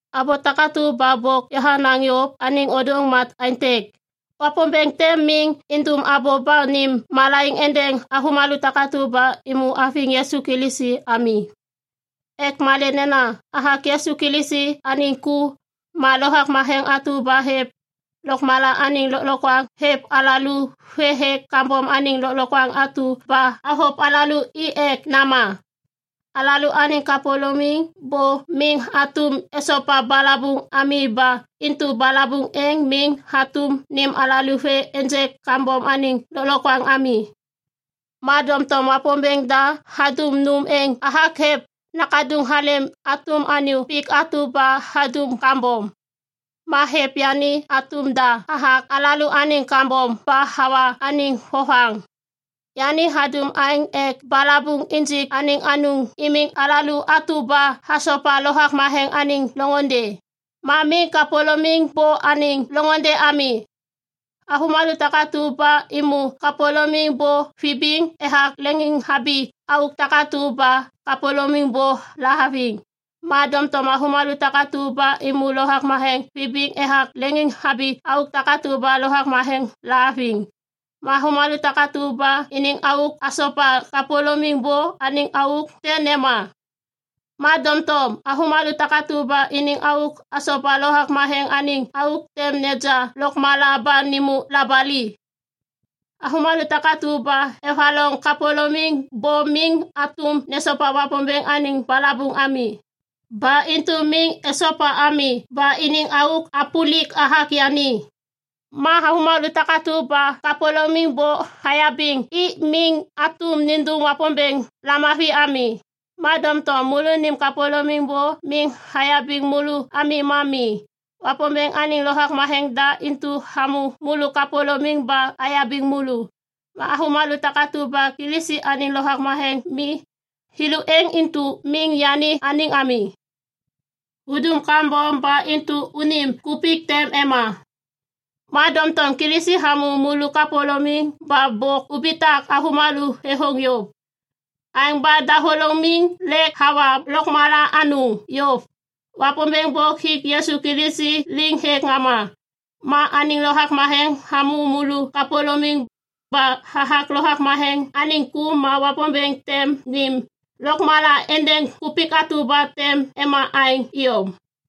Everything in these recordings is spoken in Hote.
Abô takatu ba bôk yahanaŋ yôv anêŋ ôdôŋ ma aêntêk. Wapômbêŋ tem miŋ indum abô ba nêm malaiŋ êndêŋ avômalô takatu ba êmô haviŋ Yisu Kilisi ami. Ek malê nena hathak Yisu Kilisi anêŋ ku, ma Lovak Matheŋ atu ba hêv lôkmala anêŋ lôklokwaŋ hêv alalô vê hêk kambom anêŋ lôklokwaŋ atu ba havôv alalô hi ek nama. Alalôaniŋ kapôlôŋiŋ bô miŋ hatôm esopa balabuŋ ami ba intu balabuŋ êŋ miŋ hatôm nêm alalô vê ênjêk kambom anêŋ lôklokwaŋ ami. Ma doŋtom Wapômbêŋ da hadum nôm êŋ hathak hêv Nakaduŋ halêm hatôm anyô pik atu ba hadum kambom. Ma hêv yani hatôm da hathak alalôaniŋ kambom ba hawa anêŋ vovaŋ. Yani hadum aêŋ ek balabuŋ injik anêŋ anôŋ imiŋ alalô atu ba asopa Lovak Matheŋ anêŋ loŋôndê ma miŋ kapôlôŋiŋ bô anêŋ loŋôndê ami. Avômalô takatu ba êmô kapôlôŋiŋ bô vibiŋ ethak leŋiŋhabi auk takatu ba kapôlôŋiŋ bô lahaviŋ. Ma doŋtom avômalô takatu ba êmô Lovak Matheŋ vibiŋ ethak leŋiŋhabi auk takatu ba Lovak Matheŋ lahaviŋ. Ma avômalô takatu ba iniŋ auk hasopa kapôlôŋiŋ bô anêŋ auk tem nema. Ma doŋtom avômalô takatu ba iniŋ auk hasopa Lovak Matheŋ anêŋ auk tem neja lôkmala ba nêmô labali. Avômalô takatu ba evaloŋ kapôlôŋiŋ bô miŋ hatôm nesopa Wapômbêŋ anêŋ balabuŋ ami. Ba intu miŋ esopa ami ba iniŋ auk hapôlik hathak yani. Ma avômalô takatu ba kapôlôŋiŋ bô hayabiŋ i miŋ hatôm nindum Wapômbêŋ lamavi ami. Ma doŋtom môlônim kapôlômim bô miŋ hayabiŋ môlô ami ma mi. Wapômbêŋ anêŋ Lovak Matheŋ da intu hamô môlô kapôlômim ba hayabiŋ môlô. Ma avômalô takatu ba Kilisi anêŋ Lovak Matheŋ mi, thêlô êŋ intu miŋ yani anêŋ ami. Udum kambom ba intu unim kupik tem ema. Ma doŋtom Kilisi hamô môlô kapôlômim ba bôk ubitak avômalô thêthôŋ yôv. Aêŋ ba dahôlômim lêk hawa lôkmala anôŋ yôv. Wapômbêŋ bôk hik Yisu Kilisi liŋ hêk ŋama. Ma anêŋ Lovak Matheŋ hamô môlô kapôlômim, ba hathak Lovak Matheŋ anêŋ ku ma Wapômbêŋ tem nêm lôkmala êndêŋ kupik atu ba tem ema aêŋ iyom.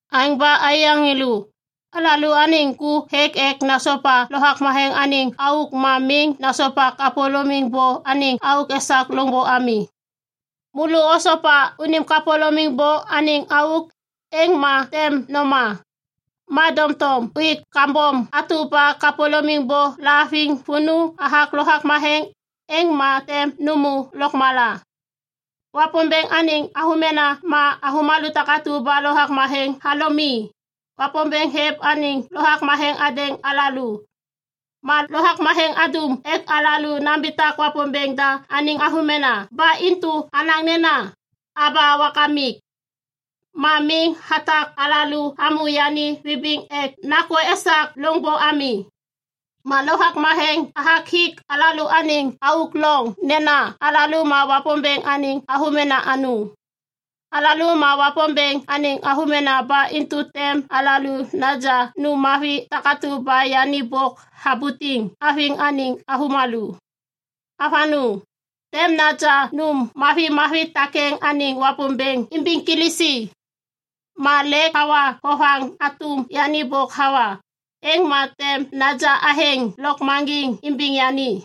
Aêŋ ba aiyaŋ thêlô, alalôaniŋ ku hêk ek nasopa Lovak Matheŋ anêŋ auk ma miŋ nasopa kapôlôŋiŋ bô anêŋ auk esak loŋbô ami. Môlô osopa unim kapôlômim bô anêŋ auk, êŋ ma tem noma. Ma doŋtom uik kambom atu ba kapôlômim bô lahaviŋ vônô hathak Lovak Matheŋ, êŋ ma tem nômô lôkmala. Wapômbêŋ anêŋ avômena ma avômalô takatu ba Lovak Matheŋ halom i. Wapômbêŋ hêv anêŋ Lovak Matheŋ hadêŋ alalô. Ma Lovak Matheŋ hadum ek alalô nambitak Wapômbêŋ da anêŋ avômena ba intu alaŋ nena, “Aba, Wakamik!” Ma miŋ hatak alalô hamô yani vibiŋ ek nakô esak loŋbô ami. Ma Lovak Matheŋ hathak hik alalôaniŋ auk loŋ nena alalô ma Wapômbêŋ anêŋ avômena anôŋ. Alalô ma Wapômbêŋ anêŋ avômena ba intu tem alalô naja nôm mavi takatu ba yani bôk habutiŋ haviŋ anêŋ avômalô. Avanôŋ, tem naja nôm mavimavi takêŋ anêŋ Wapômbêŋ imbiŋ Kilisi. Ma lêk awa vovaŋ hatôm yani bôk hawa, êŋ ma tem naja athêŋ lôkmaŋgiŋ imbiŋ yani.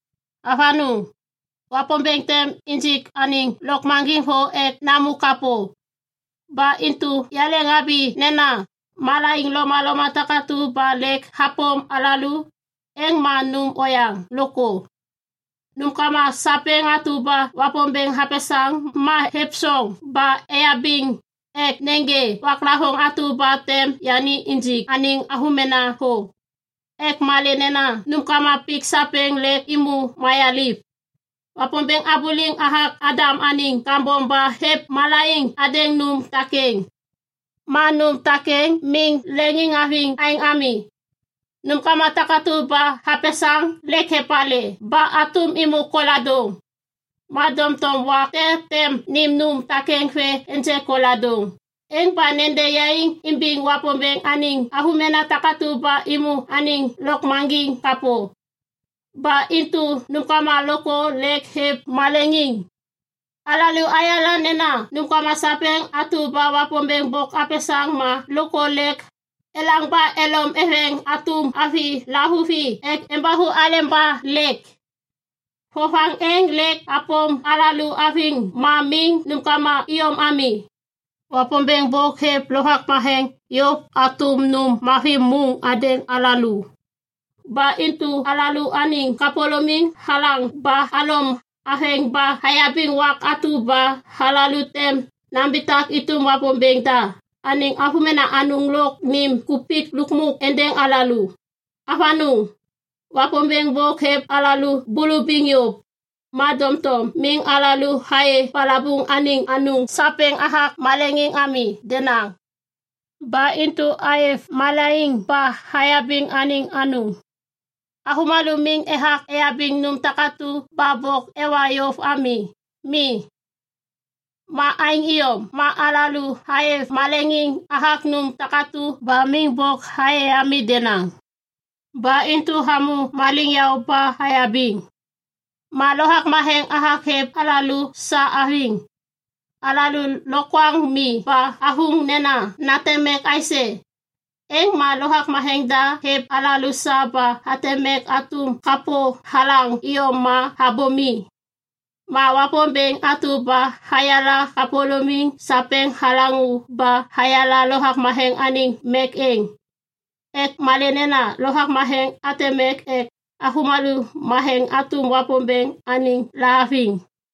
Avanôŋ, Wapômbêŋ tem injik anêŋ lôkmaŋgiŋ thô ek namô kapô. Ba intu yaleŋhabi nena malaiŋ lomaloma takatu ba lêk hapôm alalô, êŋ ma nôm oyaŋ lôkthô. Nômkama sapêŋ atu ba Wapômbêŋ hapesaŋ ma êvsoŋ ba eyabiŋ ek nêgê waklavôŋ atu ba tem yani injik anêŋ avômena thô. Ek malê nena nômkama pik sapêŋ lêk êmô mayaliv. Wapômbêŋ habuliŋ hathak Adam anêŋ kambom ba hêv malaiŋ hadêŋ nôm takêŋ. Ma nôm takêŋ miŋ leŋiŋhaviŋ aêŋ ami. Nômkama takatu ba hapesaŋ lêk epalê ba hatôm êmô koladôŋ. Ma doŋtom wak te tem nêm nôm takêŋ vê ênjêk koladôŋ êŋ ba nede yaiŋ imbiŋ Wapômbêŋ anêŋ avômena takatu ba êmô anêŋ lôkmaŋgiŋ kapô. Ba intu nômkama lôkthô lêk êv maleŋiŋ. Alalô ayala nena nômkama sapêŋ atu ba Wapômbêŋ bôk hapesaŋ ma lôkthô lêk elaŋ ba elom eveŋ hatôm avi lavuvi ek embathu aleba lêk. Vovaŋ êŋ lêk hapôm alalô haviŋ ma miŋ nômkama iyom ami. Wapômbêŋ bôk hêv Lovak Matheŋ yôv hatôm nôm mavi môŋ hadêŋ alalô. Ba intu alalôaniŋ kapôlôŋiŋ halaŋ ba halom haveŋ ba hayabiŋ wak atu ba alalô tem nambitak êtôm Wapômbêŋ da anêŋ avômena anôŋ lôk nêm kupik lukmuk êndêŋ alalô. Avanôŋ, Wapômbêŋ bôk hêv alalô bulubiŋ yôv, ma doŋtom miŋ alalô ayê balabuŋ anêŋ anôŋ sapêŋ hathak maleŋiŋ ami denaŋ. Ba intu aêv maleŋiŋ ba ayabiŋ anêŋ anôŋ. Avômalô miŋ ethak eyabiŋ nôm takatu ba bôk ewa yôv ami. Mi. Ma aêŋ iyom ma alalô aêv maleŋiŋ hathak nôm takatu ba miŋ bôk ayê ami denaŋ. Ba intu amô maliŋyaô ba ayabiŋ. Ma Lovak Matheŋ hathak hêv alalô sa haviŋ. Alalô lokwaŋ mi ba athôŋ nena nateŋ mek aisê. Êŋ ma Lovak Matheŋ da hêv alalô sa ba hateŋ mek hatôm kapô halaŋ iyom ma abô mi. Ma Wapômbêŋ atu ba hayala kapôlôŋiŋ sapêŋ halaŋô ba hayala Lovak Matheŋ anêŋ mek êŋ. Ek malê nena Lovak Matheŋ hateŋ mek ek avômalô matheŋ hatôm Wapômbêŋ anêŋ lahaviŋ.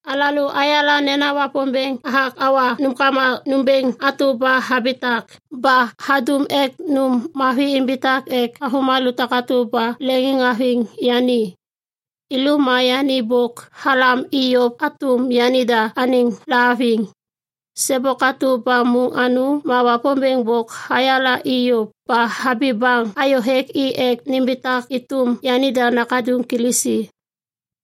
Alalô ayala nena Wapômbêŋ hathak hawa nômkama nômbêŋ atu ba habitak ba hadum ek nôm mavi imbitak ek avômalô takatu ba leŋiŋhaviŋ yani. Thêlô ma yani bôk halam i yôv hatôm yanida anêŋ lahaviŋ. Sêbôk atu ba môŋ anôŋ ma Wapômbêŋ bôk hayala i yôv ba habi baŋ hayôhêk i ek nimbitak êtôm yanida Nakaduŋ Kilisi.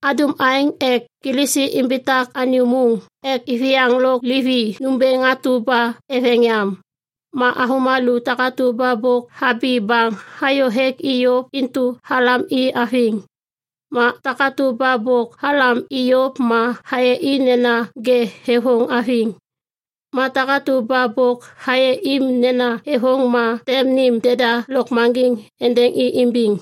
Hadum aêŋ ek Kilisi imbitak anyô môŋ ek iviyaŋ lôk livi nômbêŋ atu ba eveŋ yam. Ma avômalô takatu ba bôk habi baŋ hayô hêk i yôv intu halam i haviŋ. Ma takatu ba bôk halam i yôv ma hayê i nena ŋê thêthôŋ haviŋ. Ma takatu ba bôk hayê i nena thêthôŋ ma tem nêm deda lôkmaŋgiŋ êndêŋ i imbiŋ.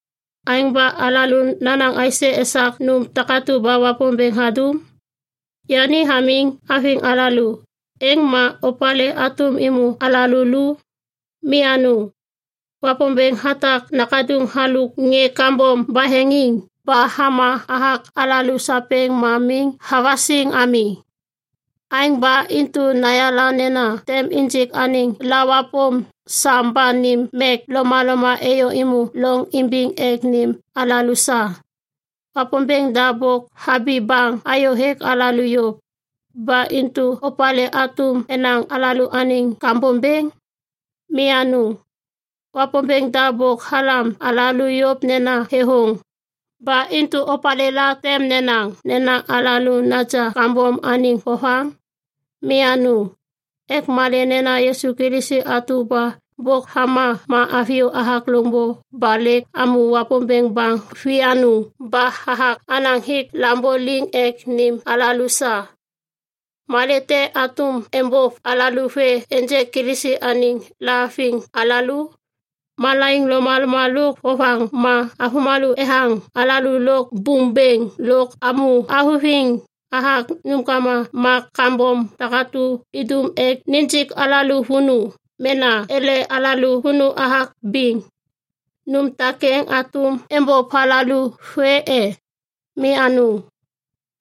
Aêŋ ba alalô nanaŋ aisê esak nôm takatu ba Wapômbêŋ hadum? Yani hamiŋ haviŋ alalô, êŋ ma opalê hatôm êmô alalô lu? Mi anôŋ! Wapômbêŋ hatak Nakaduŋ halôk ŋê kambom baheŋiŋ ba hama hathak alalô sapêŋ ma miŋ havasiŋ ami. Aêŋ ba intu nayala nena tem injik anêŋ lawapôm sam ba nêm mek lomaloma êyô êmô loŋ imbiŋ ek nêm alalô sa. Wapômbêŋ da bôk habi baŋ hayôhêk alalô yôv. Ba intu opalê hatôm enaŋ alalôaniŋ kambom bêŋ? Mi anôŋ, Wapômbêŋ da bôk halam alalô yôv nena thêthôŋ! Ba intu opalêla tem nenaŋ nena alalô naja kambom anêŋ vovaŋ? Mi anôŋ. Ek malê nena Yisu Kilisi atu ba bôk hama ma haviyô hathak loŋbô ba lêk hamô Wapômbêŋ baŋ vianôŋ ba hathak hanaŋ hik lambô liŋ ek nêm alalô sa. Malê te hatôm êmbôv alalô vê ênjêk Kilisi anêŋ lahaviŋ alalô? Malaiŋ lomaloma lôk vovaŋ ma avômalô ethaŋ alalô lôk bôm bêŋ lôk amô thavuthiŋ hathak nômkama ma kambom takatu idum ek nijik alalô vônô mena ele alalô vônô hathak biŋ, nôm takêŋ hatôm êmbôv alalô vê e? Mi anôŋ!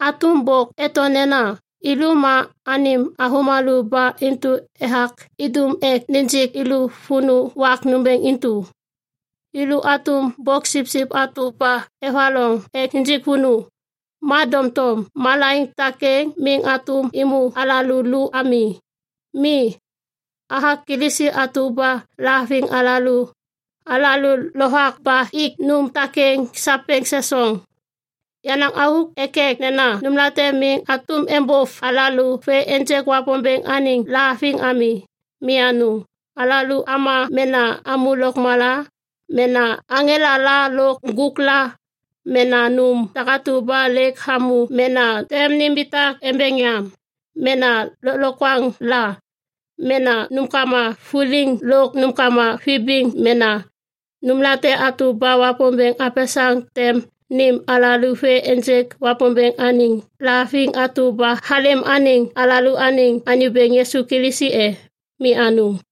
Hatôm bôk eto nena, “Yêlô ma anêm avômalô ba intu ethak idum ek nijik yêlô vônô wak nômbêŋ intu. Yêlô hatôm boksipsip atu ba evaloŋ ek nijik vônô.” Ma doŋtom malaiŋ takêŋ miŋ hatôm êmô alalô lu ami. Mi, hathak Kilisi atu ba lahaviŋ alalô, alalô lovak ba ik nôm takêŋ sapêŋ sesoŋ. Yenaŋ auk thekthek nena nômlate miŋ hatôm êmbôv alalô vê ênjêk Wapômbêŋ anêŋ lahaviŋ ami. Mi anôŋ! Alalô ama mena amô lôkmala, mena aŋela la lôk ŋgôk la, mena nôm takatu ba lêk hamô mena tem nimbitak embeŋ yam, mena lôklokwaŋ la, mena nômkama vuliŋ lôk nômkama vibiŋ, mena nômlate atu ba Wapômbêŋ hapesaŋ tem nêm alalô vê ênjêk Wapômbêŋ anêŋ lahaviŋ atu ba halêm anêŋ alalôaniŋ Anyô Bêŋ Yisu Kilisi e? Mi anôŋ!